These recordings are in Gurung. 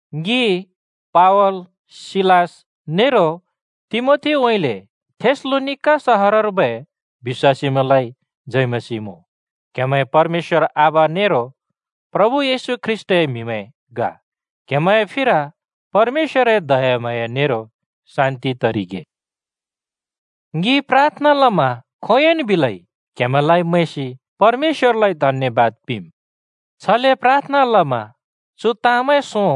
ङि पावल, सिलास नेरो तिमोथीउँइँले थेसलोनिका सहरर्बै बिश्‍वासीमैंलाइ जय मसीह मुँ। क्हेमैं परमेश्‍वर आबा नेरो प्रभु येशू ख्रीष्‍टए म्हिमैं ग। क्हेमैंए फिर परमेश्‍वरए दयाम्हाँया नेरो शान्‍ति तरिगे। ङि प्राथना लमा खोंयोंन् बिलै क्‍हेमैंलाइ मैंसि परमेश्‍वरलाइ धन्‍यबाद पिंम्। छले प्राथना लमा चु ताँमैं सों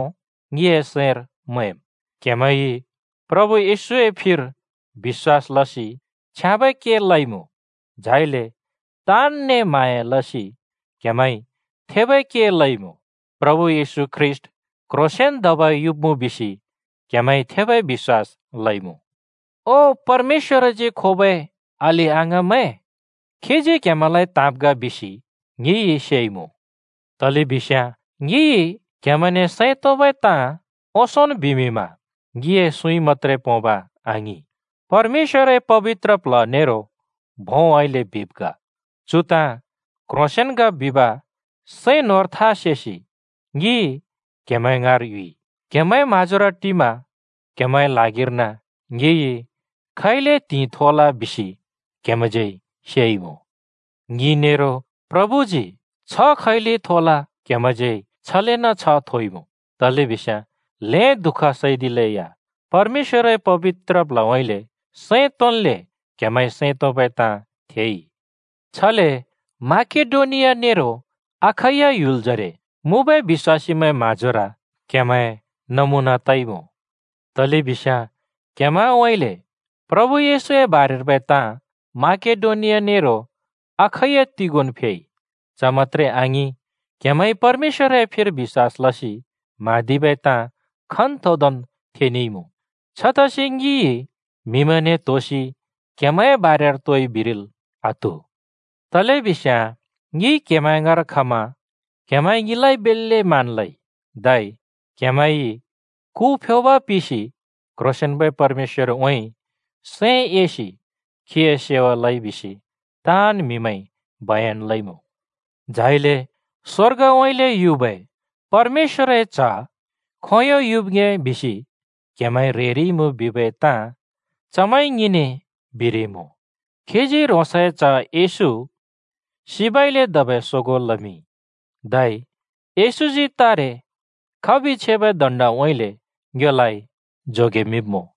ङिए सैंर मैंम्: क्‍हेमैंइ प्रभु येशूए फिर बिश्‍वास लसि छ्याँबै के लइमुँ। झाइले ताँनने म्हाँया लसि क्‍हेमैंइ थेबै के लइमुँ। प्रभु येशू ख्रीष्‍ट क्ह्रोंसेंन धबै युब्‍मुँ बिसि क्‍हेमैंइ थेबै बिश्‍वास लइमुँ। ओ परमेश्‍वरजी खोबै अलि-अङाँमैं, खीजी क्‍हेमैंलाइ त्हाँब् ग बिसि ङिइ सेइमुँ। तलेबिस्याँ ङिइ क्हेमैंने सैं तोंबै ताँ ओंसोंन् बिमिंमा ङिए सुँइ मत्‍त्रे पोंब आङिं, परमेश्‍वरए पबित्र प्ल्ह नेरो भोंउँइँले बिब् ग। चु ताँ क्ह्रोंसेंन् ग बिब सैं न्‍होंर था सेसि ङि क्‍हेमैं ङाँर युइ। क्‍हेमैंए म्‍हाँजोर टिमा क्‍हेमैंए ल्हागिर्न ङिइ खैले त्हिंइ थोल बिसि क्‍हेमैंज्यै सेइमुँ। ङि नेरो प्रभुजी छ्ह खैले थोल क्हेमैंज्यै या छलेन् छ्ह थोइमुँ, तलेबिस्याँ ल्‍हें दुःख सैदिलेया परमेश्‍वरए पबित्र प्ल्हउँइँले सैं तोंन्‍ले क्‍हेमैंइ सैं तोंबै ताँ थेइ। छले माकेडोनिया नेरो अखैया ह्‍युलजरे मुँबै बिश्‍वासीमैंए म्हाँजोर क्‍हेमैं नमुना तइमुँ। तलेबिस्याँ क्‍हेमैंउँइँले प्रभु येशूए बारेर्बै ताँ माकेडोनिया नेरो अखैया तिगोंन् फेइ। च मत्‍त्रे आङिं, क्हेमैंइ परमेश्‍वरए फिर बिश्‍वास लसि म्हाँदिबै ताँ खन्तोंदोंन् थेनेइमुँ। छतसि ङिइ म्‍हिमैंने त्‍होसि क्‍हेमैंए बारेर तोइ बिरिल् आत्‍हु। तलेबिस्‍याँ ङि क्हेमैं ङाँर खमा क्हेमैंइ ङिलाइ बेल्‍ले मान लइ, धै क्‍हेमैंइ कु (मूर्ति) फ्योब पिसि क्‍ह्रोंसेंन्‍बै परमेश्‍वरउँइँ सैं एसि खीए सेवा लइ बिसि ताँन् म्हिमैंइ बयन लइमुँ। झाइले स्वर्गउँइँले युबै परमेश्‍वरए च्‍ह खोंयों युब् ङ्‍हे बिसि क्हेमैं ह्रेरिइमुँ बिबै ताँ चमैंइ ङिने बिरिमुँ। खीजी ह्रोंसए च्ह येशू सिबइले धबै सोगों लमिंइ, धै येशूजी तारे खबि छेबै दण्डउँइँले ङ्योलाइ जोगेमिंब्मुँ।